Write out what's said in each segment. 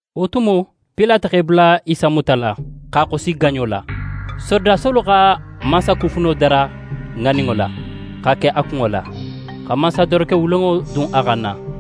Wo tumo, Pilate x'e bula Isa mutala, x'a xosi gaɲo la. Sorodasolu xa mansakufuno dara ŋaninŋo la, x'a ke a kunŋo la, xa mansadoroke wulenŋo dun a xanna.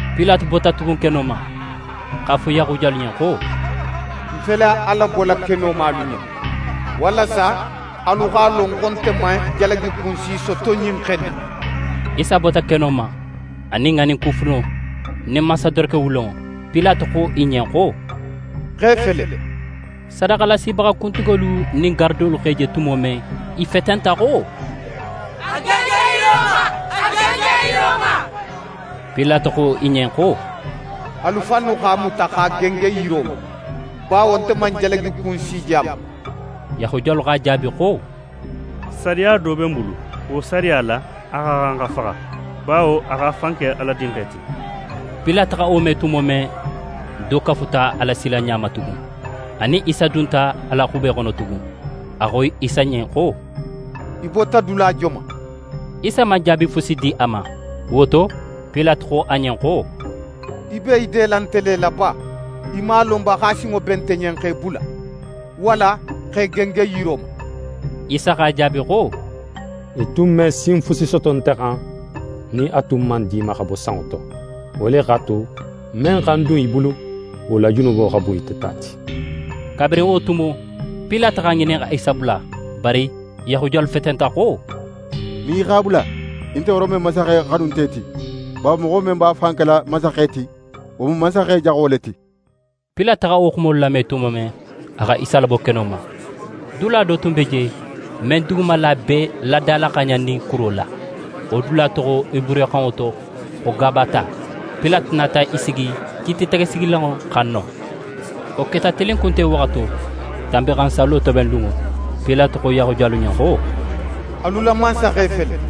Pilate bota tugun keno ma, x'a fo Yahudiyalu ɲen xo: «Ń fele a labola keno ma alu ɲen, walasa alu x'a lon xo nte man jalagikun si soto ɲin xe in na.» Isa bota keno ma, a nin ŋaninkufuno nin mansadoroke wulenŋo. Pilate xo i ɲen xo: «Xe fele.» Sadaxalasibaxa kuntigolu nin garadolu x'a je tumo men, i fetenta xo: «A gengen yiro ma, a gengen yiro ma!» Pilate xo i ɲen xo: «Alu fannu x'a muta, x'a gengen yiro ma, bawo nte man jalagikun si je a ma.» Yahudiyalu x'a jaabi xo: «Sariya do be n bulu. Wo sariya la, a xa xan xa faxa, bawo a x'a fan ke Ala Dinxe ti.» Pilate xa wo me tumo men, do kafuta a la silanɲa ma tugun. A nin Isa dunta a la xube xono tugun, a xo Isa ɲen xo: «Í bota dula joman?» Isa man jaabi fusi di a ma. Wo to, Pilate xo a ɲen xo: «Í be í dela nte le la ba? Í man a lon ba xo a sinŋo be nte ɲen x'é bula, walla x'é gengen yiro ma?» Isa x'a jaabi xo: «Í tun me sin fusi soto nte xan nin a tun man di í ma xa bo sanŋo to. Wo le x'a tu, men xa ń dun í bulu, wo la junubo xa bun ite ta ti.» Kabirin wo tumo, Pilate x'a ŋinin xa Isa bula. Bari Yahudiyalu fetenta xo: «Nin í x'a bula, í nte Rome mansaxe xanunte ti. Bawo moxo men b'a fan kela mansaxe ti, wo mu mansaxe jaxo le ti.» Pilate xa wo xumolu lame tumo men, a xa Isa labo keno ma. Dula do tun be je, men dugumala be dalaxaaɲannin kuro la. Wo dula toxo heburuxanŋo to xo «Gabata». Pilate nata í sigi kiititegesigilanŋo xan non. Wo keta tilinkunte waxato, Tanbinxansallo tobenlunŋo. Pilate xo Yahudiyalu ɲen xo: «Alu la mansaxe fele.»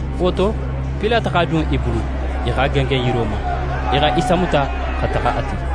Wo to, Pilate x'a dun i bulu, i x'a gengen yiro ma. I xa Isa muta xa taxa a ti.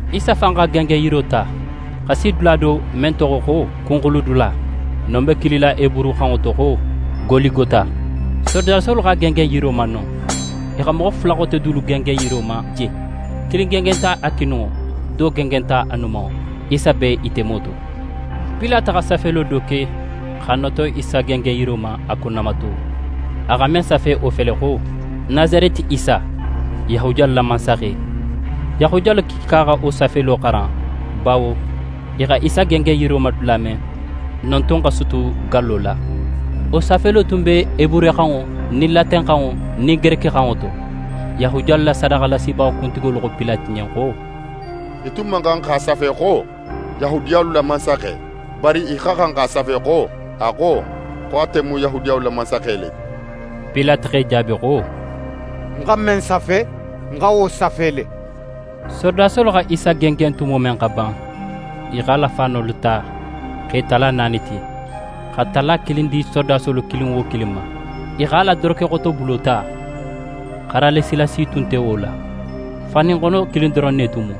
Isa fan x'a gengenyiro ta, xa na si dula do, men toxo xo «Kunxuludula». Non be kilila heburuxanŋo to xo «Goligota». Sorodasolu x'a gengen yiro ma non. I xa moxo fula xote dulu gengen yirolu ma je. Kilin gengenta a kininŋo, do gengenta a numanŋo, Isa be i temo to. Pilate xa safelo do ke, x'a noto Isa gengenyiro ma, a kunnamato. A xa men safe, wo fele xo: «Nasareti Isa, Yahudiyalu la mansaxe.» Yahudiyalu kiika xa wo safelo xaran, bawo i xa Isa gengen yiro ma dula men, non tun xa sutu gallo la. Wo safelo tun be heburuxanŋo nin latenxanŋo nin gerekixanŋo to. Yahudiyalu la sadaxalasibaxa kuntigolu xo Pilate ɲen xo: «Í tun man xan x'a safe xo: “Yahudiyalu la mansaxe”. Bari í xa xan x'a safe xo: “A xo, xo ate mu Yahudiyalu la mansaxe le ti.”» Pilate x'e jaabi xo: «Ń xa men safe, ń xa wo safe le!» Sorodasolu xa Isa gengen tumo men xa ban, i x'a la faanolu ta x'e tala naani ti, xa tala kilin di sorodasolu kilin wo kilin ma. I x'a la dorokexotobulo ta, xaralisila si tun nte wo la. Faanuxono kilin doron ne tun mu,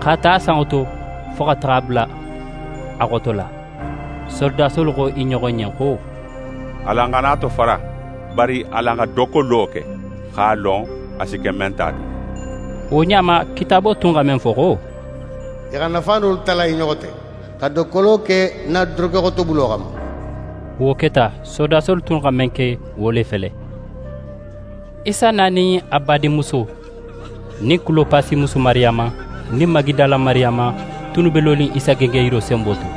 x'a ta a sanŋo to, fo x'a bula a xoto la. Sorodasolu xo i ɲoxo ɲen xo: «Alan xana a tofara, bari alan xa dokkolo ke, x'a lon, a si ke men ta ti.» Wo ɲa ma, Kitaabo tun xa men fo xo: «I xa ń na faanolu tala i ɲoxo te, xa dokkolo ke ń na dorokexotobulo xanma,» wo keta. Sorodasolu xa men ke, wo le fele. Isa na nin a na badinmuso, anin Kulopasi musu Mariyama, nin Magidala Mariyama tunnu be lonin Isa gengenyiro senbo to.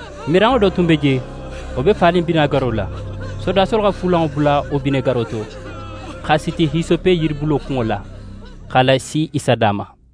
Miranŋo do tun be je, wo be fanin binegaro la. Sorodasolu xa fuulanŋo bula wo binegaro to, x'a siti hisope yiribulo kunŋo la, x'a lasi Isa da ma.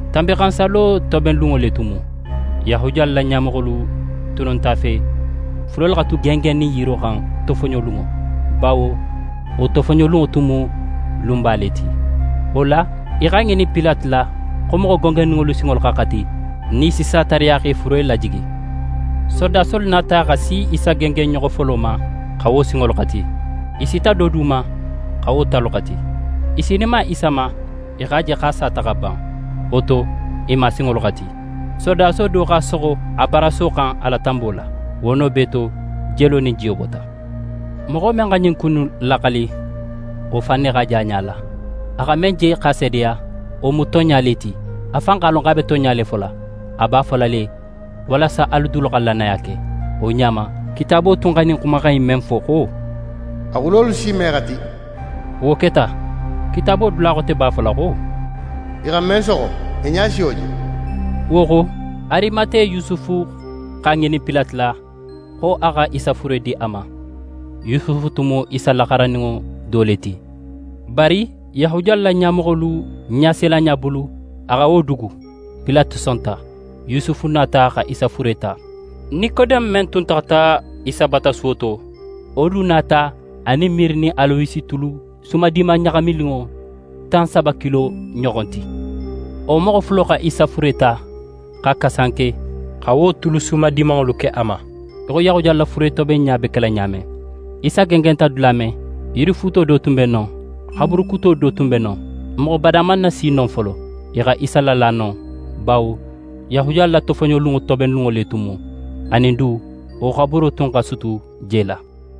Tanbinxansallo tobenlunŋo le tun mu. Yahudiyalu la ɲamoxolu tunnu nt'a fe furelu xa tu gengennin yiro xan tofoɲolunŋo, bawo wo tofoɲolunŋo tun mu lunba le ti. Wo la, i x'a ŋinin Pilate la, xo moxo gengenninŋolu sinxalolu xa xati, nin i si sa tariya x'e fure lajigi. Sorodasolu nata xa si Isa gengenɲoxo folo ma, xa wo sinxalolu xati, i sita do du ma, xa wo talu xati. I sininma Isa ma, i x'a je xo a sata xa ban. Wo to, i man a sinxalolu xati. Sorodaso do x'a soxo a baraso xan a la tanbo la. Wo no bee to, jelo nin jiyo bota. Moxo men xa ɲin ku innu laxali, wo fan ne x'a je a ɲa la. A xa men je x'a seedeya, wo mu tonɲa le ti. A fan x'a lon xo a be tonɲa le fola. A b'a fola le walasa alu dulu xa lannaya ke. Wo ɲa ma, Kitaabo tun xa ɲin xumaxan in men fo xo: «A xulolu si me xati», wo keta. Kitaabo dula xote b'a fola xo: «I xa men soxo, i ɲa si wo je.» Wo xo, Arimate Yusufu x'a ŋinin Pilate la, xo a xa Isa fure di a ma. Yusufu tun mu Isa la xarandinŋo do le ti. Bari Yahudiyalu la ɲamoxolu ɲasilanɲa bulu, a xa wo dugu. Pilate sonta. Yusufu nata, xa Isa fure ta. Nikodeme men tun taxata Isa bata suwo to, wo du nata a nin mire nin alowesi tulu sumadiman ɲaxamininŋo tan saba kilo ɲoxon ti. Wo moxo fulo xa Isa fure ta, x'a kasanke, xa wo tulu sumadimanŋolu ke a ma, í xo Yahudiyalu la furetobenɲa be kela ɲa men. Isa gengenta dula men, yirifuuto do tun be non, xaburu kuto tun be non, moxo bada man nasi non folo. I xa Isa lala non, bawo Yahudiyalu la tofoɲolunŋo tobenlunŋo le tun mu, anin du, wo xaburo tun xa sutu je la.